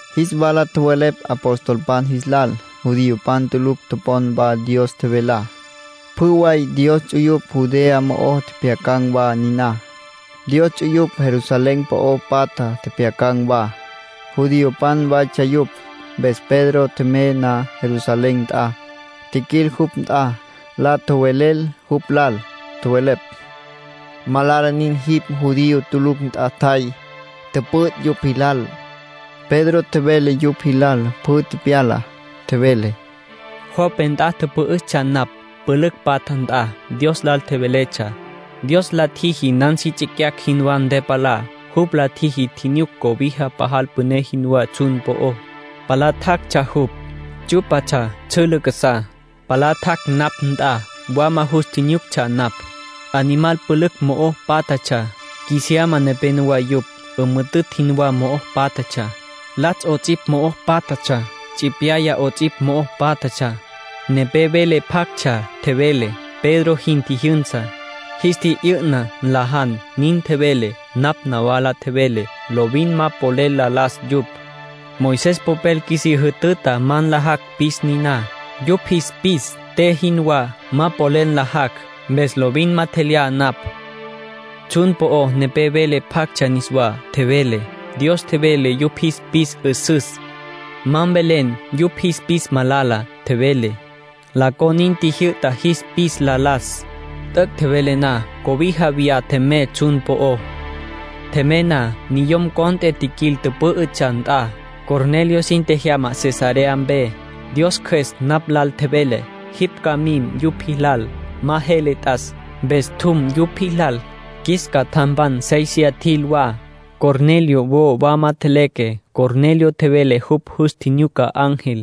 Jis wala tjowelepj apostolpan jis lal judiopan tulucj topon wa Dios tjevelá. Pjü way Dios ts'uyupj Judea mo'ó tjepjyacan̈ wa niná. Dios ts'uyupj Jerusalén po'o patja tjepjyacan̈ wa. Judiopan waytsja yupj. Mpes Pedro tjemey na Jerusalén nt'a, tjiquil jupj nt'a. La tjowelel jupj lal. Tjowelepj: —Malala nin jipj judío tulucj nt'a tjay, tüpüt' yupj jilal. Pedro tjevele yupj jilal pjü tepyalá. Tjevele: —Jope nt'a tüpü'üstsja napj, pülücj patja nt'a. Dios lal tjeveletsja. Dios la tjiji nan si tsicyacj jinwá ntepalá. Jupj la tjiji tjinyuc cobija pajal püné jinwá tsjun po'ó. Palá tjactsja jupj. Tsyú'patsja tsjülǘ casá. Palá tjac' napj nt'a. Wama jus tjinyuctsja napj. Animal pülücj mo'o pátjatsja. Qjuisiyasma nepenowá yupj. 'Ümüjütütj jinwá mo'o pátjatsja. Latsj 'ots'ipj mo'o pátjatsja. Tsipyaya 'ots'ipj mo'o pátjatsja. Nepé vele pjactsja, tjevele: ‘Pedro, jin tjijyünsa. Jis tji'yü'na, nlajan’, nin tjevele. Napj wola tjevelé: ‘Lovin ma polel la las yupj. Moisés popel qjuisí jütüta ma nlajacj pis niná. Yupj jis pis te jinwá, ma polel nlajacj, mpes lovin ma tjelyá napj.’ Tsjun po'o nepé vele pjactsja niswá. Tjevele: ‘Dios tjevele yupj jis pis 'üsüs. Ma mvelen yupj jis pis malala’, tjevele. La con nin tjijyü'ta jis pis la las. T'üc' tjevele na, cobija viyá tjemey tsjun po'ó. ”Tjemey na, niyom cont'e tjiquil tüpü'üstsja nt'a. Cornelio sin tjejyama Cesarea mpe. Dios Cjües napj lal tjevele: ‘Jipj ca mim yupj jilal. Ma jele t'as.’ Mpes tjum yupj jilal. Qjuis catjampan séisiya tjil wa. Cornelio wo wama tjeleque. Cornelio tjevele jupj jus tjinyuca ángel,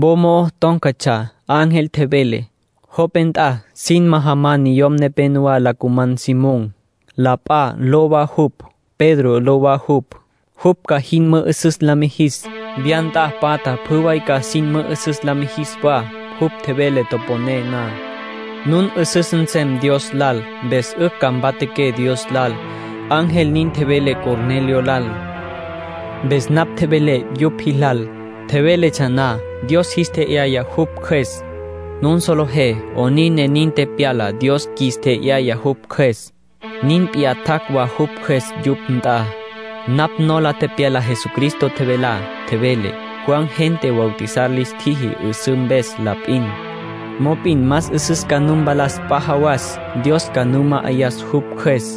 wo mo'o tón̈catsja. Ángel tjevele: ‘Jope nt'a sin majaman niyom nepenowá la cuman Simón. La p'a ló wa jupj, Pedro ló wa jupj. Jupj ca jin mü'üsüs la mijis. Wya nt'a patja pjü way ca sin mü'üsüs la mijis wa. Jupj tjevele toponé na, nun 'üsüs nsem Dios lal, mpes 'ücj ca mpatjaqué Dios lal’, ángel nin tjevele Cornelio lal. ”Mpes napj tjevelé yupj jilal. Tjeveletsja na, Dios jis tje'yaya jupj Cjües. Nun solejé 'onin ne nin tepyala Dios qjuis tje'yaya jupj Cjües. Nin p'iyá tjac' wa jupj Cjües yupj nt'a. Napj nola tepyala Jesucristo tjevelá. Tjevele: ‘Juan gente bautizar lis tjiji 'üsǘ mpes la p'in. Mop'in más 'üsüs ca nu mpalas p'a jawas. Dios ca nu ma'ayas jupj Cjües.’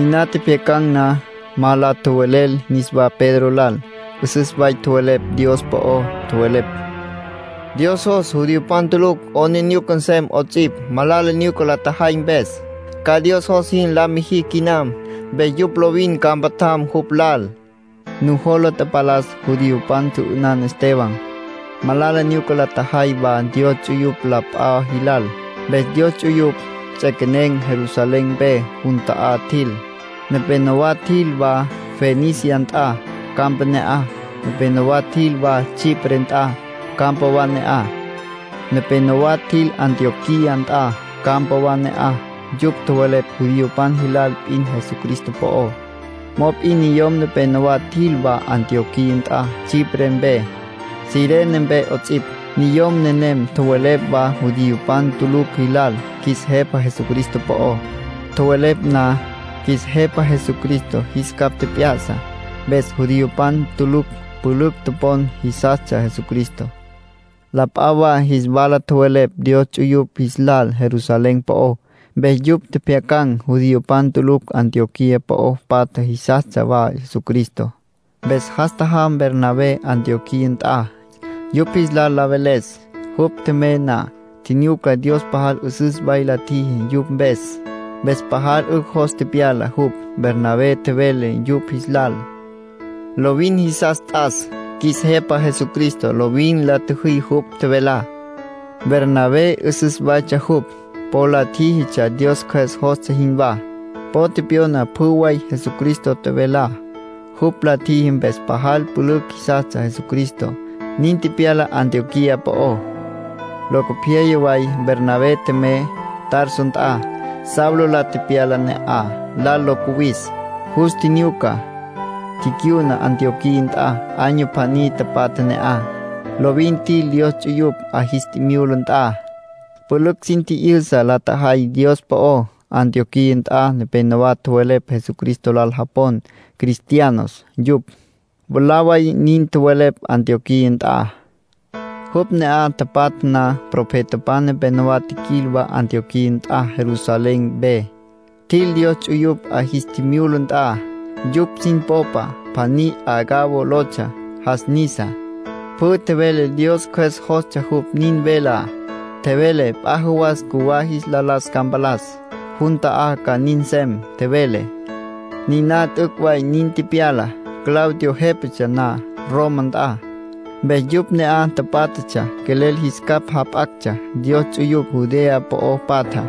Niná tjepjyacan̈ na, ma la tjowelel niswá Pedro lal. 'Üsüs way tjowelepj Dios po'ó. Tjowelepj: —Dios jos judiopan tulucj 'aplijila nsem 'ots'ipj, malala nyuca la tjajay mpes; ca Dios jos jin la mijicj quinam. Mpes yupj lovin ca mpatjam jupj lal —nin tjowelepj. Nujola tapalas judiopan tjü'ünan Esteban. Malala nyuca la tjajay wa Dios ts'uyupj la p'a jilal. Mpes Dios ts'uyupj ts'equenen̈ Jerusalén mpe. Jun ta'á tjil. Nepenowá tjil wa Fenicia nt'a, campa ne'aj. Nepenowá tjil wa Chipre nt'a, campa wa ne'aj. Nepenowá tjil Antioquía nt'a, campa wa ne'aj. Yupj tjowelepj judiopan jilal p'in Jesucristo po'ó. Mop'in niyom nepenowá tjil wa Antioquía nt'a Chipre mpe, Cirene mpe 'ots'ipj. Niyom nenem tjowelepj wa judiopan tulucj jilal qjuis Jepa Jesucristo po'ó. Tjowelepj na, qjuis Jepa Jesucristo jis capj tjep'ya'sa. Mpes judiopan tulucj pülücj topon, jisastsja Jesucristo. La p'a wa jis wala tjowelepj Dios ts'uyupj jis lal Jerusalén po'ó, mpes yupj tjepjyacan̈ judiopan tulucj Antioquía po'o patja jisastsja wa Jesucristo. Mpes jas tjajam Bernabé Antioquía nt'a, yupj jis lal la veles. Jupj tjemey na, tjinyuca Dios pajal 'üsüs way la tjiji yupj mpes. Mpes pajal 'ücj jos tepyala jupj. Bernabé tjevele yupj jis lal: “Lovin jisas t'as qjuis Jepa Jesucristo. Lovin la tjüjí jupj tjevelá.” Bernabé 'üsüs waytsja jupj. Po la tjíjitsja Dios Cjües jostsja jinwá. Po tepyona pjü way Jesucristo tjevelá. Jupj la tjiji mpes pajal pülücj jisastsja Jesucristo; nin tepyala Antioquía po'ó. Locopyaya way Bernabé tjemey Tarso nt'a, Saulo la tepyala ne'aj, lal lo cuwis. Jus tjinyuca, ticyuna Antioquía nt'a. Año pjaní tapatja ne'aj. Lovin tjil Dios ts'uyupj 'a jis tjimyula nt'a. Pülücj sin tji'yüsa la tjajay Dios po'ó. Antioquía nt'a nepenowá tjowelepj Jesucristo lal japon “Cristianos” yupj. Mwalá way nin tjowelepj Antioquía nt'a. Yupj ne'aj tapatja na, profetapan nepenowá tjiquil wa Antioquía nt'a Jerusalén mpe. Tjil Dios ts'uyupj 'a jis tjimyula nt'a. Yupj sin popa pjaní Agabo lotsja. Jas nisa. Pjü tjevele Dios Cjües jostsja jupj nin velá. Tjevele p'a jawasa cjuwá jis la las ca mpalas. Jun ta'á ca nin nsem, tjevele. Niná t'üc' way nin tepyala, Claudio jépatsja na Roma nt'a. Mpes yupj ne'aj pátjatsja quelel jis capj jap'actsja Dios ts'uyupj Judea po'o patjá.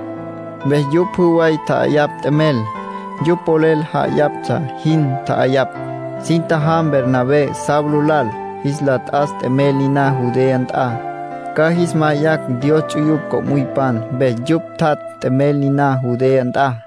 Mpes yupj pjü way tja'ayapj t'emel. Yupj polel ja'ayaptsja jin tja'ayapj. Sin tjajam Bernabé, Saulo lal, jis la t'as t'emel niná Judea nt'a, ca jis ma'ayacj Dios ts'uyupj co'müypan. Mpes yupj tjat' t'emel niná Judea nt'a.